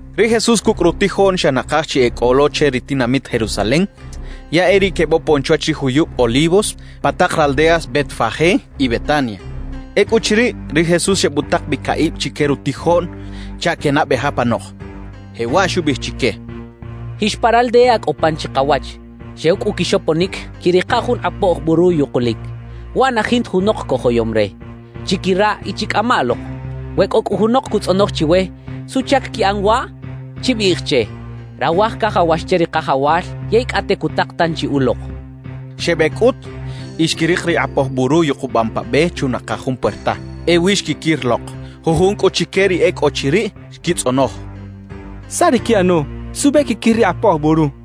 Ri Jesús cucꞌ rutijoꞌn xa nakaj chi e cꞌo lo che ri tinamit Jerusalem, ya e riꞌ quebopon chwach ri juyub Olivos pa tak raldeas Betfagé y Betania. Ecꞌuchiriꞌ, ri Jesús xebutak bi caꞌib chique rutijoꞌn chaꞌ quenabej apanok, jewaꞌ xubiꞌij chique: —Jix pa raldea cꞌo pan chikawach. Xew cꞌu quixoponic, quiꞌrika jun kꞌapoj buru yukulic. Waꞌ na jinta junok cojoyom re. Chiquiraꞌ y chicꞌama lok. We cꞌo cꞌu junok cutzꞌonoj chiwe: “¿Suꞌchac quiꞌan waꞌ?”, chibiꞌij che: “Rawaj cajawax che ri Kajawal, yey cꞌate cutak tanchi ulok” —quixchaꞌ. Xebec cꞌut y xquirik ri kꞌapoj buru yukubam pa be chunakaj jun puerta. Ewi xquiquir lok. Jujun cꞌu chique ri e cꞌo chiriꞌ xquitzꞌonoj: —¿Saꞌ ri quiꞌano? ¿Suꞌbe quiquir ri kꞌapoj buru? —xechaꞌ.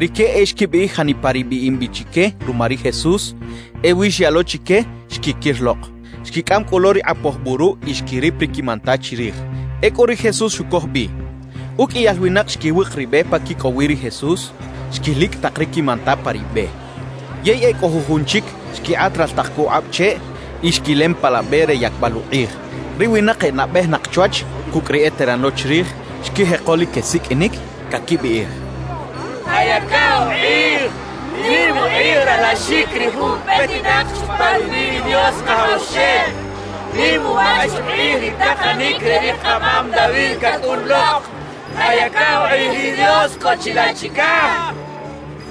Rique e xquibiꞌij janipa ri biꞌim bi chique ruma ri Jesús; ewi xyaꞌ lo chique xquiquir lok. Xquicꞌam cꞌu lo ri kꞌapoj buru y xquirip ri quimanta chirij. Ecꞌu ri Jesús xucoj bi. Uqꞌuiyal winak xquiwik ri be pa quicꞌow wi ri Jesús, xquilicꞌ tak ri quimanta pa ri be; yey e cꞌo jujun chic xquikꞌat raltak co ukꞌab cheꞌ y xquilem pa la be re yacbal ukꞌij. Ri winak e nabejinak chwach cucꞌ ri eteran lo chirij xquijeko lic quesiqꞌuinic, caquibiꞌij: «¡Kayaca ukꞌij! ¡Nim ukꞌij ralaxic ri jun petinak chupa rubiꞌ ri Dios Kajawxel! ¡Nim uwach ukꞌij ri takanic re ri kamam David cacꞌun lok! ¡Kayaca ukꞌij ri Dios cꞌo chilaꞌ chicaj!» quechaꞌ.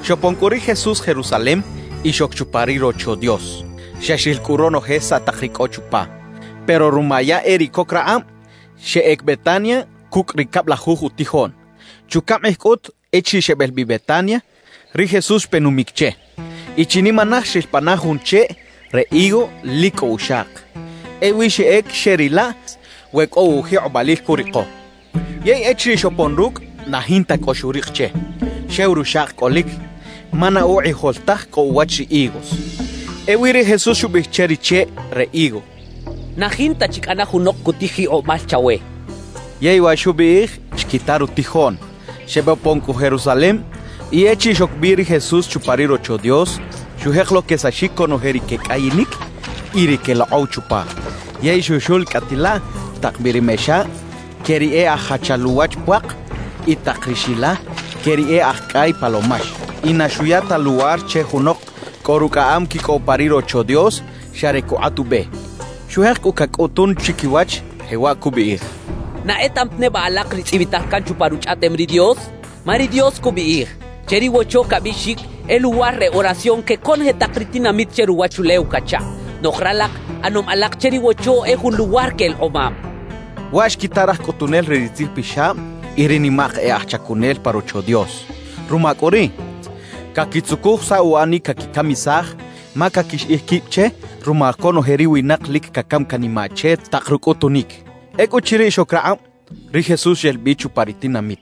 Xopon cꞌu ri Jesús Jerusalem y xoc chupa ri Rocho Dios. Xa xril cꞌu ronoje saꞌ tak ri cꞌo chupa; pero ruma ya e riꞌ coc rakꞌab, xeꞌec Betania cucꞌ ri cablajuj utijoꞌn. Chucaꞌm kꞌij cꞌut echiriꞌ xebel bi Betania, ri Jesús xpe numic che. Y chinimanaj xril pana jun cheꞌ re higo lic cꞌo uxak. Ewi xeꞌec xeꞌrilaꞌ we cꞌo ujikꞌobalil curiko. Yey echiriꞌ xopon rucꞌ, na jinta cꞌo xurik che, xew ruxak cꞌolic, ma na ukꞌijol taj cꞌo uwach ri higos. Ewi ri Jesús xubiꞌij che ri cheꞌ re higo: —Na jinta chi cꞌana junok cutij jikꞌobal chawe —xchaꞌ. Yey wa xubiꞌij, xquita rutijoꞌn. Xebopon cꞌu Jerusalem y echiriꞌ xoc bi ri Jesús chupa ri Rocho Dios, xujek lo quesaxic conoje ri quecꞌayinic y ri quelokꞌow chupa. Yey xuxulcꞌatilaꞌ tak bi ri mexa que ri e aj jachal uwach puak y tak ri xila que ri e aj cꞌay palomax. Y na xuya ta luwar che junok cꞌo rucꞌaꞌam quicꞌow pa ri Rocho Dios xa re cukꞌat ube. Xujek cꞌu cacꞌutun chiquiwach, jewaꞌ cubiꞌij: «¿Na etaꞌam ta neba alak ri tzꞌibital can chupa Ruchꞌaꞌtem ri Dios? Ma ri Dios cubiꞌij: Che ri Wocho cabiꞌxic: “E luwar re oración que conoje tak ri tinamit che ruwachulew” cachaꞌ. Noꞌj ralak, ꞌanom alak che ri Wocho e jun luwar que elekꞌomab» xchaꞌ. Waꞌ xquita raj cꞌutunel re ri tzijpixab y ri nimak e aj chacunel pa Rocho Dios. Ruma cꞌu riꞌ, caquitzucuj saꞌ uꞌanic caquicamisaj ma caquixiꞌij quib che ruma conoje ri winak lic cacam canimaꞌ che tak rucꞌutunic. Ecꞌuchiriꞌ xoc rakꞌab, ri Jesús xel bi chupa ri tinamit.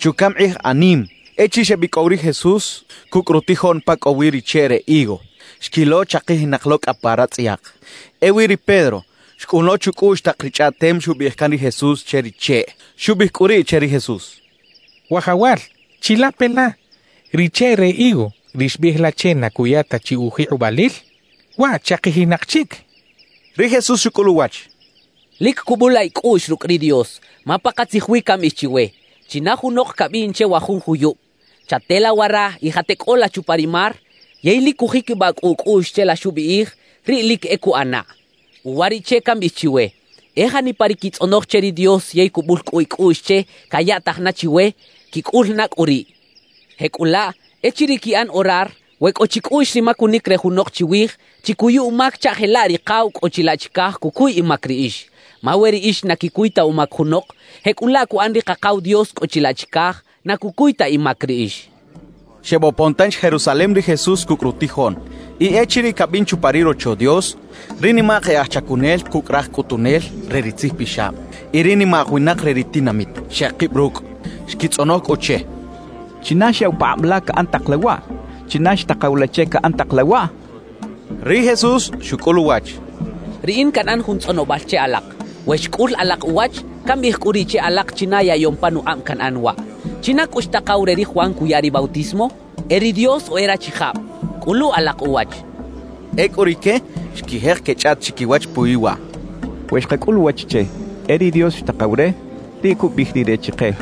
Chucaꞌm kꞌij anim echiriꞌ xebicꞌow ri Jesús cucꞌ rutijoꞌn pa cꞌo wi ri cheꞌ re higo, xquilo chakijinak lo cꞌa pa ratzꞌayak. Ewi ri Pedro xcꞌun lo chucꞌuꞌx tak ri chꞌaꞌtem xubiꞌij can ri Jesús che ri cheꞌ. Xubiꞌij cꞌu riꞌ che ri Jesús: —Wajawal, chilape la, ri cheꞌ re higo ri xbiꞌij la che na cuya ta chi ujikꞌobalil, waꞌ chakijinak chic —xchaꞌ. Ri Jesús xucꞌul uwach: —Lic cubula icꞌuꞌx rucꞌ ri Dios; ma pakatzij wi cambiꞌij chiwe: China junok cabiꞌn che wa jun juyub: “Chatela wara y jateꞌcꞌola chupa ri mar” yey lic cujiquibaꞌ cꞌu ucꞌuꞌx che la xubiꞌij, riꞌ lic e cuꞌanaꞌ. Uwariꞌche cambiꞌij chiwe: E janipa ri quitzꞌonoj che ri Dios yey cubul cꞌu icꞌuꞌx che cayaꞌtaj na chiwe, quicꞌul na cꞌu riꞌ. Jecꞌulaꞌ, echiriꞌ quiꞌan orar, we cꞌo chicꞌuꞌx ri macunic re junok chiwij, chicuyu umac chaꞌ jelaꞌ ri Kakaw cꞌo chilaꞌ chicaj cucuy imac riꞌix. Ma we riꞌix na quicuy ta umac junok, jecꞌulaꞌ cuꞌan ri Kakaw Dios cꞌo chilaꞌ chicaj, na cucuy ta imac riꞌix —xchaꞌ. Xebopon tanchi Jerusalem ri Jesús cucꞌ rutijoꞌn. Y echiriꞌ cabin chupa ri Rocho Dios, ri nimak e aj chacunel cucꞌ raj cꞌutunel re ri tzijpixab y ri nimak winak re ri tinamit, xekib rucꞌ. Xquitzꞌonoj cꞌu che: —¿China xyaꞌw pakꞌab la caꞌan tak la waꞌ? ¿China xtakaw la che caꞌan tak la waꞌ? —xechaꞌ. Ri Jesús xucꞌul uwach: —Riꞌin canꞌan jun tzꞌonobal che alak. We xcꞌul alak uwach, cambiꞌij cꞌu riꞌ che alak china yaꞌyom panukꞌab canꞌan waꞌ. ¿China cꞌu xtakaw re ri Juan cuya ri bautismo? ¿E ri Dios o e rachijab? Cꞌulu alak uwach —xchaꞌ. Ecꞌu rique xquijek quechꞌaꞌt chiquiwach puwi waꞌ: «We xkacꞌul uwach che: “E ri Dios xtakaw re,” riꞌ cubiꞌij rire chike: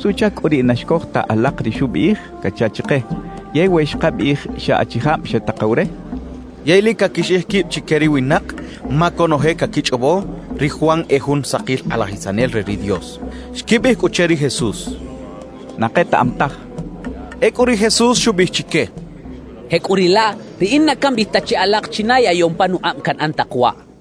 “¿Suꞌchac cꞌu riꞌ na xcoj ta alak ri xubiꞌij?” cacha chike. ¿Yey we xkabiꞌij xa achijab xetakaw re...?» xecha chiquiwach. Yey lic caquixiꞌij quib chique ri winak, ma conoje caquichꞌobo ri Juan e jun sakil kꞌalajisanel re ri Dios. Xquibiꞌij cꞌu che ri Jesús: —Na ketaꞌam taj —xechaꞌ. Ecꞌu ri Jesús xubiꞌij chique: —Jecꞌuriꞌlaꞌ, riꞌin na cambiꞌij ta che alak china yaꞌyom panukꞌab canꞌan tak waꞌ —xchaꞌ.